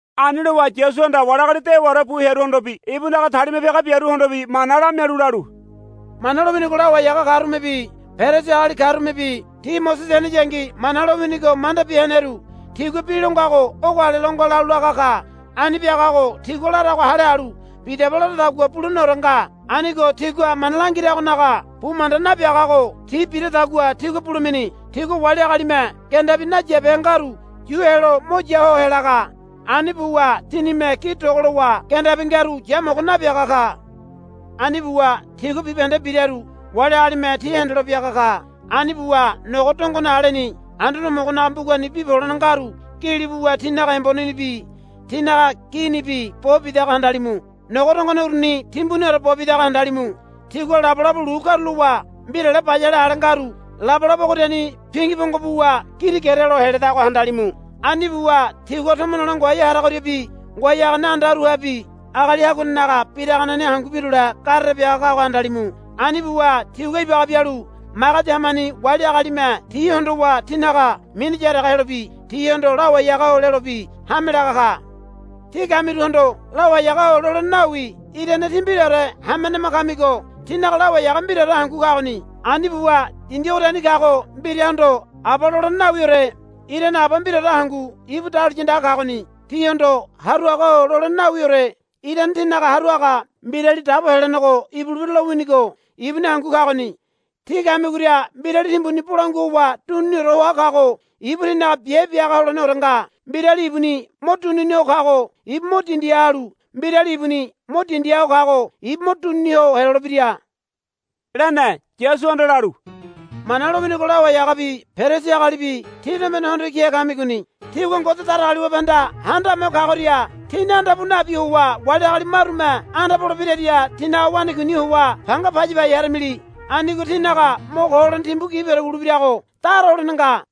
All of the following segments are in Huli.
Ani lowa Yasuhanda wali agali dewaore bu hearuhondobi ibunaga talima piaga biaruhondobi mana lamialu lalu, Mana lowinigo lawai haga karumebi Perisi agali karumebi ti Mosese heneyangi Mana lowinigo mandabi heneru tigua bi lo ngago ogo ale lo nga lalu laga ka. Ani biagago tigua larago hale halu bidaba laradagua buleneore nga. Anigo tigua mana langiragonaga bu manda nabiagago ti biradagua tígua bulemini. Tigua wali agalime gendabi nayabehe ngaru yu helo mo ya ho helaga. Ani buwa tinime gi dogolowa gendabi ngaru yamogo nabiaga ka. Ani buwa tigua bibahende biraru wali agalime ti hendelo biaga ka. Ani buwa nogo dongone aleni Anduane Homogonaga mbugani bi polene ngaru gili buwa tinaga embonenibi tinaga ginibi bo bidago handalimu. Nogo dongone uruni timbuniore bo bidago handalimu. Tigua labolabo lu karulowa mbirale bayale ale ngaru labolabo ogoriani pingi pongo buwa girigerelo heledago handalimu. Ani buwa tigua tomo nole ngoai haragoriabi ngoai hagane andaruhabi agali haguanenaga biraganeni hangu birule gere biraga kago handalimu. Ani buwa tigua ibaga bialu magedi hamani wali agalime ti hondowa tinaga mini yaraga helobi tihondo, Lawai haga-o, lelobi hame laga ka. Tí kamiruhondo, Lawai haga-o, lolene nawi irane tí mbiraore hamenema kamigo tínaga Lawai haga mbiraore hangu kagoni. Ani buwa dindi ogoriani kago mbirahondo, Aba, lolene nawiore irane Aba mbiraore hangu ibu dahuliya andaga kagoni. Tíhondo, Haru haga-o, lolene nawiore irane tínaga haru haga Mbirali Dabo Helenego ibulebira lowinigo ibuni hangu kagoni. Tí kamigoria mbirali timbuni bolangua howa dunini hoa kago ibu tínaga biabe bia haga holeneore nga. Mbirali ibuni mo dunini ho kago ibu mo dindiha halu mbirali ibuni mo dindiha ho kago ibu mo dunini ho helolebira, lene. Yasuhanda lalu, Mana lowinigo lawai hagabi Perisi agalibi tí tombene hondo kihe kamigoni. Tígua Ngode Datagaliwabehanda Handame Ho Kagoria tíni anda pu nabi howa wali agali marume anda pole biraria tinaga wanakuini howa panga paya pai haramili. Anigo tínaga mo ko holene timbu gibiore wulebirago dara holene nga. [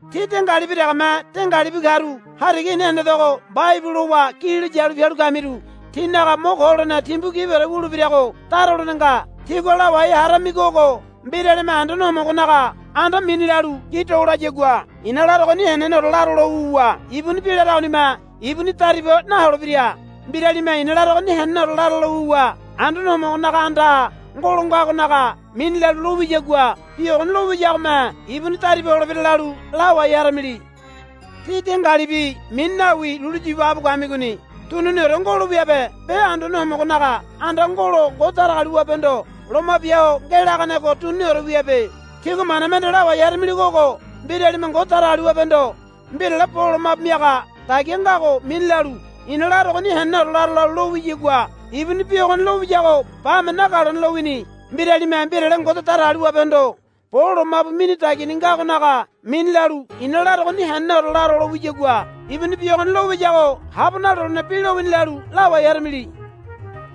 Tí dengalibi degeme dengalibi karu hariga i̱na hendedogo mbaibu lowa gililo yalu pialu kamiru tínaga mo ko holene timbu gibiore wulebirago dara holene nga. Tígua lawai haramigo ogo. Mbiralime Anduane Homogonaga anda mini lalu gi dolayagua i̱na larogoni heneneore laro lo wuwa ibuni bi laragonime ibuni dariba naholebira. Mbiralime i̱na larogoni heneneore laro lo wuwa Anduane Homogonaga andaha ngolo ngagonaga mini lalu lo wiyagua bi ogoni lo wiyagome ibuni dariba holebira, lalu lawai haramili. Tí dengalibi mini nawi lulu yu ibaga bu kamigoni. Duniniore ngolo wiabe be Anduane Homogonaga anda ngolo Ngode Datagaliwabehondo loma bia ho ngelaganego duniniore wiabe. Tígua mana mende lawai haramiligo ogo. Mbiralime Ngode Datagaliwabehondo mbirale bo lomabu miaga dagia ngago mini lalu i̱na larogoni heneneore laro lo wiyagua ibuni bi ogoni lo wiyago bame nagalone lowini. Mbiralime mbirale Ngode Datagaliwabehondo bo lomabu mini dagiani ngagonaga mini lalu i̱na larogoni heneneore laro lo wiyagua ibuni bi ogoni lo wiyago habo nalolene bi lowini, lalu lawai haramili.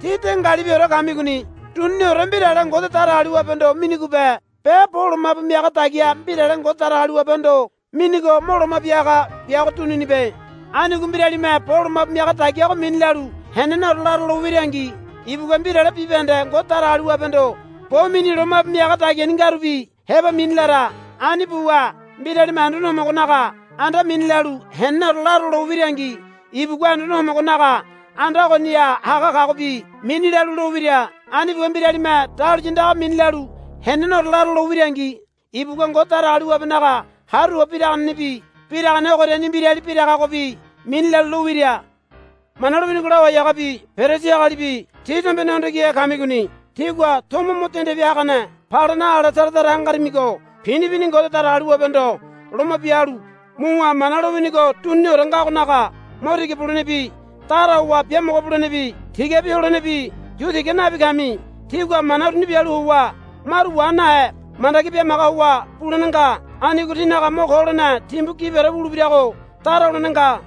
Tí dengalibiore kamigoni. Duniniore mbirale Ngode Datagaliwabehondo minigobe be bo lomabu miaga dagia mbirale Ngode Datagaliwabehondo minigo mo loma bia haga biago duninibe. Anigo mbiralime bo lomabu miaga dagiago mini lalu heneneore laro lo wirangi ibugua mbirale bibahende Ngode Datagaliwabehondo bo mini lomabu miaga dagiani ngarubi heba mini lara. Ani buwa mbiralime Anduane Homogonaga anda mini lalu heneneore laro lo wirangi ibugua Anduane Homogonaga anda ogoniha haga kagobi mini lalu lo wira. Ani buwa mbiralime dahuliya andaga mini lalu heneneore laro lo wirangi ibugua Ngode Datagaliwabenaga haru howa biraganebi biragane ogoriani mbirali biragagobi mini lalu lo wira. Mana lowinigo lawai hagabi Perisi agalibi tí tombene hondo kihe kamigoni. Tígua tomo mo dende bia hagane palena ale tara tara hangarimigo pini pini Ngode Datagaliwabehondo loma bia halu muwa Mana lowinigo duniniore ngagonaga mo tiga bulenebi dara howa biamogo bulenebi tigabi holenebi yu tiga nabi kami. Tígua mana uruni bialu howa maru wa nahe mandagi bimaga howa bulene nga. Anigo tínaga mo ko holene timbu gibiore wulebirago dara holene nga.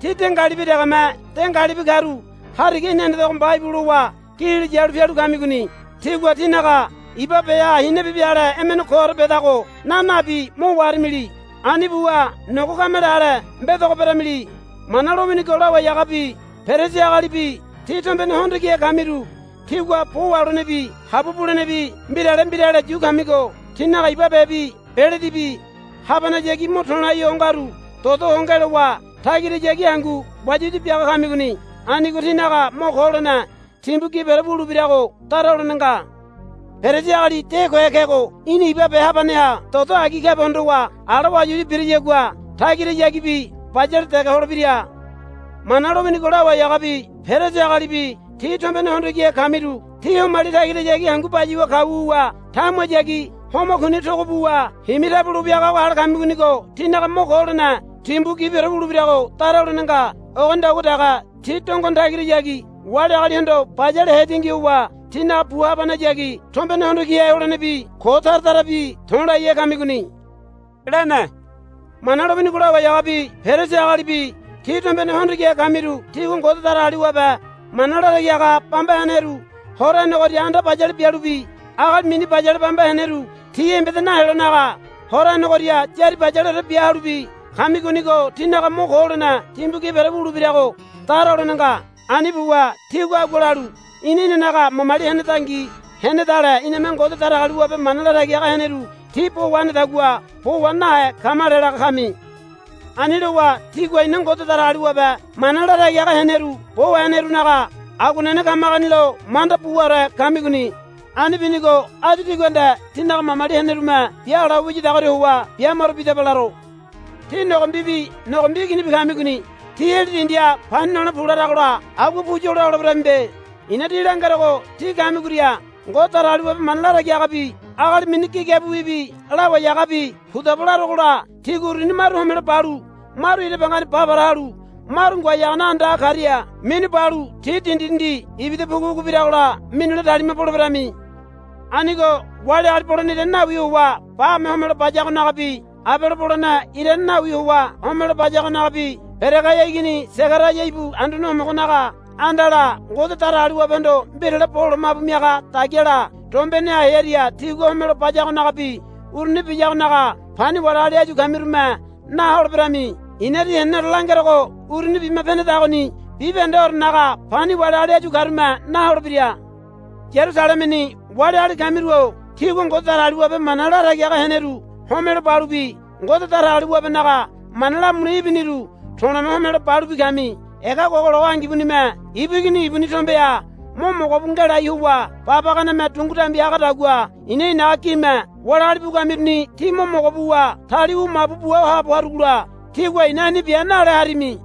Tí dengalibi degeme dengalibi karu hariga i̱na hendedogo mbaibu lowa gililo yalu pialu kamigoni. Tígua tínaga iba beha hinabibi ale emene koore bedago na nabi mo waharamili. Ani buwa nogo kamele ale mbedogo beramili. Mana lowinigo lawai hagabi Perisi agalibi tí tombene hondo kihe kamiru tígua bo waholenebi habua bulenebi mbirale mbirale yu kamigo tínaga iba bebi beledibi habanehayagi mo to̱lai ho ngaru dodo ho ngelowa tagirahayagi hangu wayawaya biaga kamigoni. Anigo tínaga mo ko holene timbu gibiore wulebirago dara holene nga. Perisi agali de kohe kego í̠na iba be habaneha dodo agi kabe hondowa ala wayawaya biriyagua tagirahayagibi bayale dege holebira. Mana lowinigo lawai hagabi Perisi agalibi tí tombene hondo kihe kamiru tí homali tagirahayagi hangu bayuwa kau wuwa tamuhayagi homa kuni togo buwa himi tabulo wiagago ale kamigonigo tínaga mo ko holene timbu gibiore wulebirago dara holene nga. Ogonidagua dege tí dongone tagirahayagi wali agalihondo bayale hetingi howa tínaga bu habanehayagi tombene hondo kihe holenebi ko tara tarabi to̱laihe kamigoni, lene. Mana lowinigo lawai hagabi Perisi agalibi tí tombene hondo kihe kamiru tígua Ngode Datagaliwabe mana latagi haga bamba heneru hora henegoria anda bayale bialubi agali mini bayale bamba heneru tí embeda naholenaga hora henegoria yári bayaleore bia halubi kamigonigo tínaga mo ko holene timbu gibiore wulebirago dara holene nga. Ani buwa tígua agua lalu, Ina inanaga mamali henedangi henedale iname Ngode Datagaliwabe mana latagi heneru ti bo wahenedagua bo wa nahe kamale, laga kami. Ani lowa tígua ina Ngode Datagaliwabe mana latagi haga heneru bo wahenerunaga aguanene kamagoni lo manda buore kamigoni. Ani binigo áyu tígua nde tínaga mamali henerume biala ho wiyadagoria howa bu maro bidaba laro. Tí nogombibi nogombi iginibi kamigoni. Tí heli dindiha pani nole pu laragola agua pu yola holeberamibe. I̱na tí langerogo tí kamigoria Ngode Datagaliwabe mana latagi hagabi agali mini gigabiwibi lawai hagabi pudaba larogola tígua uruni maru homelo balu maru ira bangani ba para halu maru ngoai hagane andaha karia minu balu ti dindi dindi ibida pugu pugu biragola minule talima poleberami. Anigo wali agali bolene irane nawi howa bame homelo bayagonagabi Abele bolene irane nawi howa homelo bayagonagabi Beregaia igini Segaraia ibu Anduane Homogonaga andala Ngode Datagaliwabehondo mbirale bo lomabu miaga dagiala dombeneha hearia tigua homelo bayagonagabi uruni biyagonaga pani wali agali áyu kamirume na holeberami. I̱na tí heneneore langerogo uruni bima penedagoni bibahendeorenaga pani wali agali áyu karume na holebira. Yarusalemeni waliagali kamiru-o tígua Ngode Datagaliwabe mana latagi haga heneru homelo balubi Ngode Datagaliwabenaga mana lamule ibiniru to̱le̱me homelo balubi kami. Ega gogologo angibunime ibu igini ibuni tombeha mo mogo bu ngelai howa babaganeme dungu dambi hagadagua i̱na i̱naga gime wali agali bu kamiruni tí mo mogo buwa tali wu mabu bua haabo harugola tígua, Í̠na ani bia, nale harimi.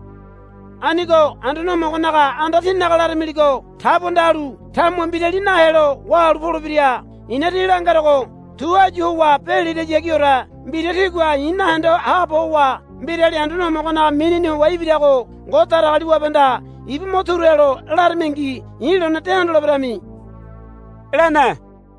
Anigo Anduane Homogonaga anda tíninaga laramiligo tabuanda halu tamuha mbirali nahe helo wahalu polebira. I̱na tí langerogo tu áyu howa be lirahayagiore mbira tígua i̱ nahende haabo howa, Mbirali Anduane Homogonaga minini howa ibirago Ngode Datagaliwabehanda ibu mo turu helo, laramingi i̱ lone de hondoleberami, lene.